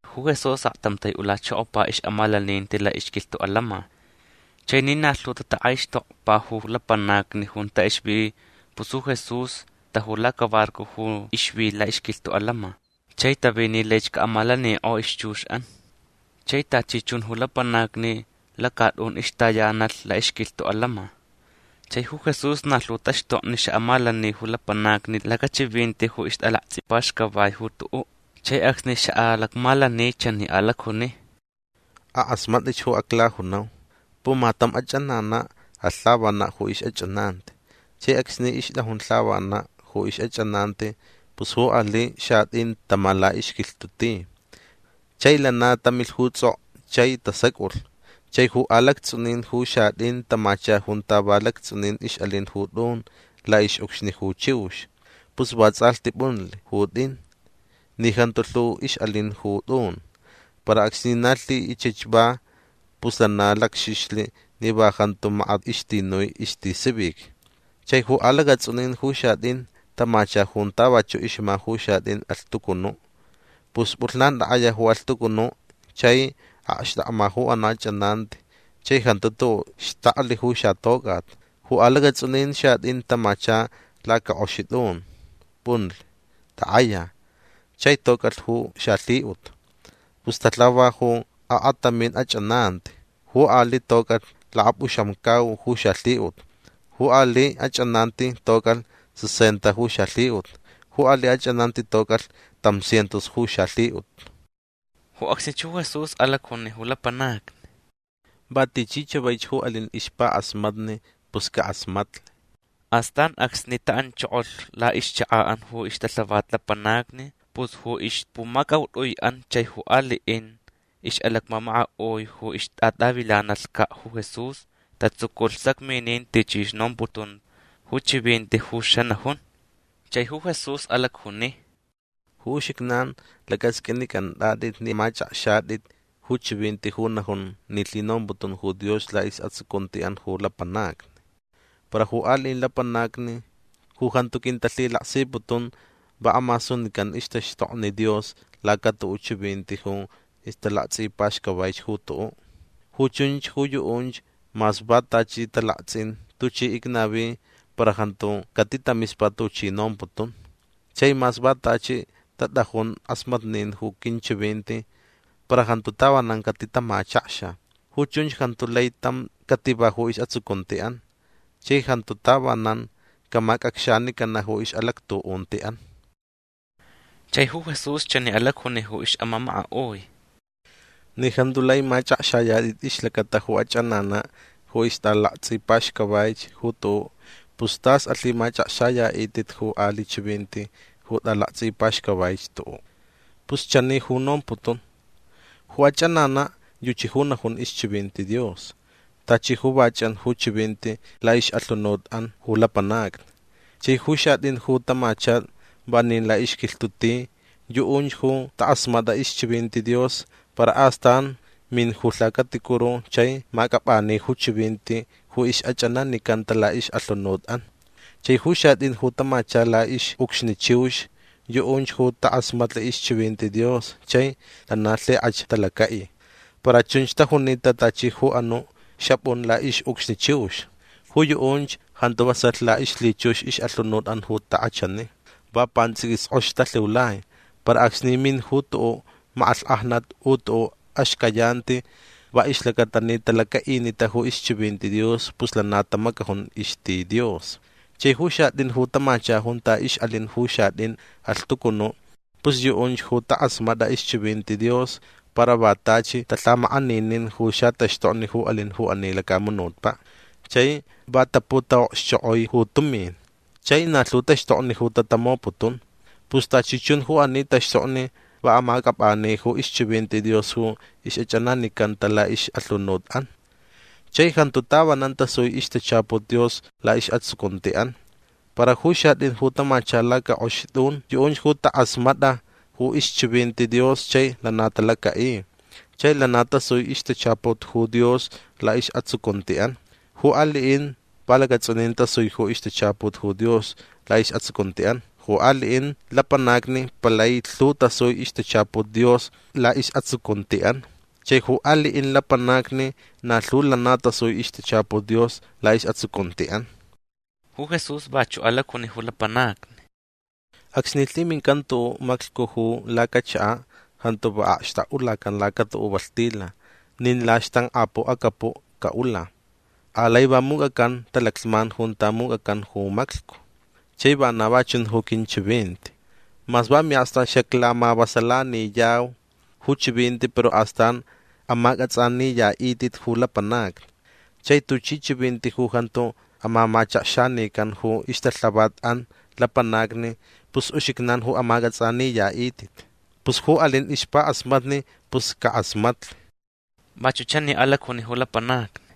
Ju Jesús aktam tai'ulachokopa ix'amalaninti la'ixquilhtu' atants'in. Chai ni na lhu tatak'aixtokpa ju lapanacni junta ixvi pus ju Jesús taju lacabarco ju ixvi la'ixquilhtu' atants'in chai tavi ni laich ca'amalanik'olh ixchux'an. Chai tachi chun ju lapanacni lacat'un ixtayanalh la'ixquilhtu' atants'in. Chai ju Jesús na lhu taxtokni xa'amalani ju lapanacni lacachivinti ju ixt'alakts'ipaxcavaich ju tu'u'. Chai acsni xa'alacmalani chani alacjuni: ―Ak'asmat'itch ju aclajunau. Pumatam ach'anana' alh lhavana' ju ix'ach'ananti. Chai acsni ixt'ajun lhavana' ju ix'ach'ananti pus ju ali' xat'in tama la'ixquilhtu' ti. Chai lana tamilh ju ts'ok'o chai tasac'ulh. Chai ju alacats'unin ju xat'in tamacha junta va lacats'unin ix'alin ju t'un la'ix'ucxni ju chiux. Pus vats'alhti p'unlh ju t'in ni jantu lhu ix'alin ju t'un. Para acsni na lhi'ichich va pus lana lacxixlh ni va jantu makat ixtinui istisivic. Chai ju alacats'unin ju xat'in tamacha junta vachu' ixma ju xat'in alhtucunu'. Pus p'ulhnan tak'aya ju alhtucunu' chai akxtakma ju anu' ach'ananti chai jantu tu'u' xtaklh ju xatoc'at. Ju alacats'unin xat'in tamacha lacak'oxi t'un. P'unlh. Tak'aya. Chai toc'alh ju xalhi'ut. Pus talhava ju akatamin ach'ananti. Ju ali' toc'alh lakap'uxamcau ju xalhi'ut. Ju ali' ach'ananti toc'alh sesenta ju xalhi'ut. Ju ali' ach'ananti toc'alh tam cientos ju xalhi'ut. Ju acsnich ju Jesús alacjuni ju lapanacni: ―Va tichi chavaich ju alin ixpak'asmatni pus cak'asmatlh. Astan acsni ta'anchokolh la'ixchaka'an ju ixtalhavat lapanacni pus ju ixpumacaut'ui'an chai ju ali'in ix'alacmamaka'ui ju ixtat'avilanalhca' ju Jesús tatsuculh sacminin tuchi ixnomputun ju chivinti ju xanajun. Chai ju Jesús alacjuni: ―Ju uxijnan lac'asq'uinic'ant'at'it ni amach'akxayat'it ju chivinti ju najun ni lhinomputun ju Dios la'is'atsucunti'an ju lapanacni. Para ju ali'in lapanacni ju jantu quintalhilaksiputun va amasunican ixtaxtokni Dios laca tu'u' chivinti ju ixt'alakts'ipaxcavaich ju tu'u'. Ju chunch ju yu'unch mas va tachi talakts'in tuchi icnavi para jantu catitamispa tuchi nomputun. Chai mas va tachi tat'ajun k'asmatnin ju quinchivinti para jantu tavanan catitamachakxa. Ju chunch jantu lai tam cativa ju is'atsucunti'an. Chai jantu tavanan camac'acxanicana' ju ix'alactu'unti'an. Chai ju Jesús chani alacjuni ju ix'amamaka'ui: ―Ni jantu lai mach'akxayat'it ixlacata ju ach'anana' ju ixt'alakts'ipaxcavaich ju tu'u' pus t'as alhimach'akxaya'it'it ju ali' chivinti ju t'alakts'ipaxcavaich tu'u'. Pus chani ju nomputun. Ju ach'anana' yuchi ju najun ixchivinti Dios. Tachi ju va ch'an ju chivinti la'ix'alhunut'an ju lapanacni. Chai ju xat'in ju tamacha vanin la'ixquilhtu' ti yu'unch ju tak'asmat'a ixchivinti Dios para astan min ju lhacaticuru chai mac'ap'ani ju chivinti ju ix'ach'ananicanta la'ix'alhunut'an. Chai ju xat'in ju tamacha la'ix'ucxni chiux yu'unch ju tak'asmatlh ixchivinti Dios chai lana lhik'ach talaca'i. Para chunch tajunita tachi ju anu' xap'un la'ix'ucxni chiux. Ju yu'unch jantu vasalh la'ixlhichux ix'alhunut'an ju tak'achani. Va pants'iquis k'ox talhiulai. Para acsni min ju tu'u' mak'alhk'ajnat u tu'u' axcayanti va ixlacata ni talaca'inita ju ixchivinti Dios pus lana tamacajun ixti Dios. Chai ju xat'in ju tamacha junta ix'alin ju xat'in alhtucunu' pus yu'unch ju tak'asmat'a ixchivinti Dios. Para va tachi talhamak'aninin ju xataxtokni ju alin ju ani lacamunutpa'. Chai va taputa'okxchok'oi ju tumin. Chai na lhu taxtokni ju tatamoputun. Pus tachi chun ju ani taxtokni va amac'ap'ani ju ixchivinti Dios ju ix'ach'ananicanta la'ix'alhunut'an. Chai jantu tavanan tasui ixtachaput Dios la'is'atsucunti'an. Para ju xat'in ju tamacha lacak'oxi t'un yu'unch ju tak'asmat'a ju ixchivinti Dios chai lana talaca'i. Chai lana tasui ixtachaput ju Dios la'is'atsucunti'an. Ju ali'in va lacats'unin tasui ju ixtachaput ju Dios la'is'atsucunti'an. Ju ali'in lapanacni palai lhu tasui ixtachaput Dios la'is'atsucunti'an. Chai ju ali'in lapanacni na lhu lana tasui ixtachaput Dios la'is'atsucunti'an. Ju Jesús vachu' alacjuni ju lapanacni: ―Acsni lhimincan ju tu'u' maclhcu ju lacachaka' jantu va akxtak'ulacan laca tu'u' valhtila nin laxtank'apu' acapu' ca'ula. Alai va muc'acan talaclhman junta muc'acan ju maclhcu. Chai vana va chun ju quinchivinti. Mas va mi'akstu'an xaclamavasalaniyau ju chivinti para astan amac'ats'aniya'it'it ju lapanacni. Chai tuchi chivinti ju jantu amamachakxanican ju ixtalhavat'an lapanacni pus uxijnan ju amac'ats'aniya'it'it. Pus ju alin ixpak'asmatni pus cak'asmatlh. Vachu' chani alacjuni ju lapanacni: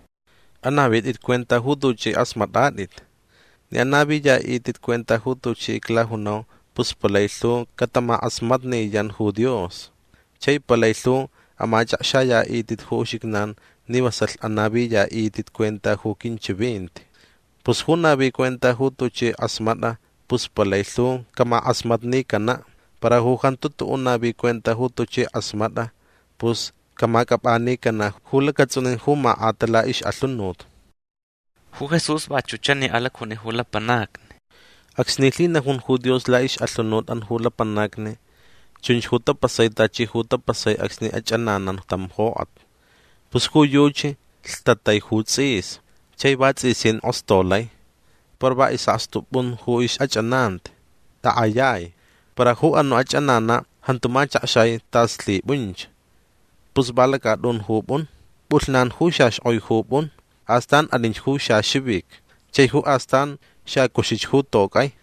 ―Anavit'it cuenta ju tuch'i k'asmat'at'it. Ni anaviya'it'it cuenta ju tuchi iclajunau pus palai lhu catamak'asmatniyan ju Dios. Chai palai lhu amach'akxaya'it'it ju uxijnan ni vasalh anaviya'it'it cuenta ju quinchivinti. Pus ju navi cuenta ju tuchi k'asmat'a pus palai lhu camak'asmatnicana'. Para ju jantu tu'u' navi cuenta ju tuchi k'asmat'a pus camac'ap'anicana' ju lacats'unin ju mak'ata la'ix'alhunut. Ju Jesús vachu' chani alacjuni ju lapanacni: ―Acsni lhinajun ju Dios la'ix'alhunut'an ju lapanacni chunch ju tapasai tachi ju tapasai acsni ach'ananan tam jok'at. Pus ju yuchi lhtatai ju ts'is. Chai vats'isin k'ostolai. Para va is'akstu p'un ju ix'ach'ananti. Tak'ayai. Para ju anu' ach'anana' jantu machakxai tas lhip'unch. Pus va lacat'un ju p'un. P'ulhnan ju xaxk'oi ju p'un. Astan alinch ju xaxivic. Chai ju astan xacuxich ju toc'ai.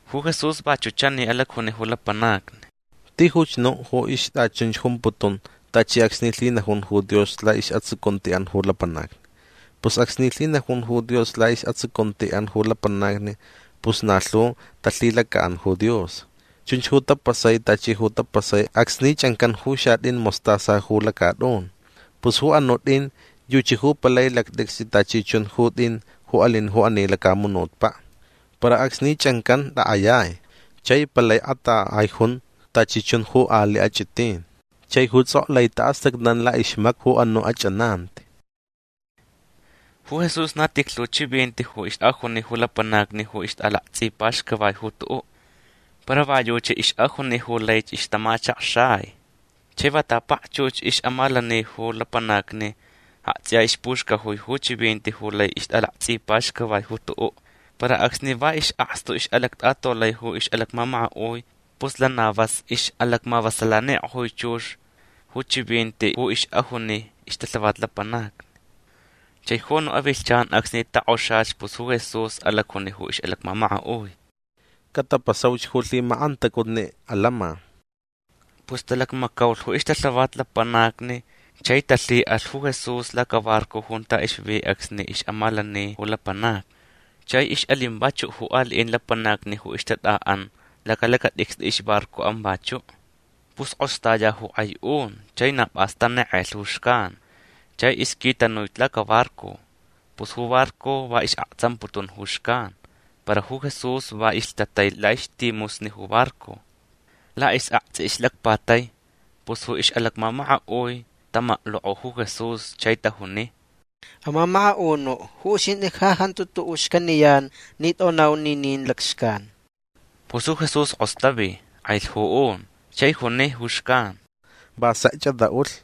Ju Jesús vachu' chani alacjuni ju lapanacni: ―Tijuch nu' ju ixt'achunch jumputun tachi acsni lhinajun ju Dios la'is'atsucunti'an ju lapanacni. Pus acsni lhinajun ju Dios la'is'atsucunti'an ju lapanacni pus na lhu talhilaca'an ju Dios. Chunch ju tapasai tachi ju tapasai acsni ch'ancan ju xat'in mostaza ju lacat'un. Pus ju anu' t'in yuchi ju palai lact'icst'i tachi chun ju t'in ju alin ju ani lacamunutpa'. Para acsni ch'ancan tak'ayai. Chai palai katak'aich jun tachi chun ali' ach'itin. Chai ju ts'ok'o lai ta'astacnan la'ixmakpu ju anu' ach'ananti. Ju Jesús na tijlhu chivinti ju ix'ajuni ju lapanacni ju ixt'alakts'ipaxcavai ju tu'u'. Para va yuchi ix'ajuni ju laich ixtamachakxai. Chai va tapakchux ju ix'amalani ju lapanacni akts'iya ixpuxcajui ju chivinti ju lai ixt'alakts'ipaxcavai ju tu'u'. Para acsni va is'akstu ix'alact'atolai ju ix'alacmamaka'ui pus lana vas ix'alacmavasalanik'ojui chux ju chivinti ju ix'ajunita ixtalhavat lapanacni. Chai ju anu' avilhchan acsni tok'oxalhch pus ju Jesús alacjuni ju ix'alacmamaka'ui: ―Catapasauch ju lhimak'antacutni atants'in. Pus talacmacaulh ju ixtalhavat lapanacni chai talhi'alh ju Jesús lacabarco junta ixvi acsni ix'amalani ju lapanacni. Chai ix'alin vachu' ju ali'in lapanacni ju ixtat'a'an lacalacat'icst'i ixbarco'an vachu'. Pus k'ostaya ju k'ai un chai na p'as tanek'elh ju xcan. Chai ixquitanuich lacabarco. Pus ju barco va is'aktsamputun ju xcan. Para ju Jesús va ilhtatai la'ixtimusni ju barco. La'is'akts'i ixlacpatai. Pus ju ix'alacmamaka'ui tamaklok'o ju Jesús chai tajuni: ―Amamaka'unu' ju uxint'i ja jantu tu'u' xcaniyan ni t'onau ninin lacxcan. Pus ju Jesús k'ostavi. K'ailh ju un. Chai juni ju xcan: ―Va sekch at'a'ulh.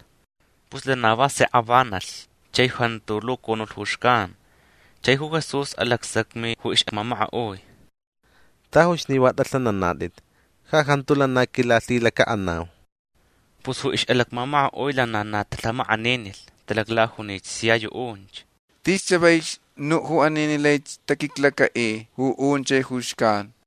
Pus lana va sek avanalh chai jantu lucunulh ju xcan. Chai ju Jesús alacsacmi ju ix'amamaka'ui: ―Tajuch ni va t'alhananat'it. Ja jantu lana quilalhilaca'anau. Pus ju ix'alacmamaka'ui lana na talhamak'aninilh. Talaclajunich sia yu'unch: ―Tis chavaich nu' ju ani ni laich taquiclaca'i ju un chai ju xcan.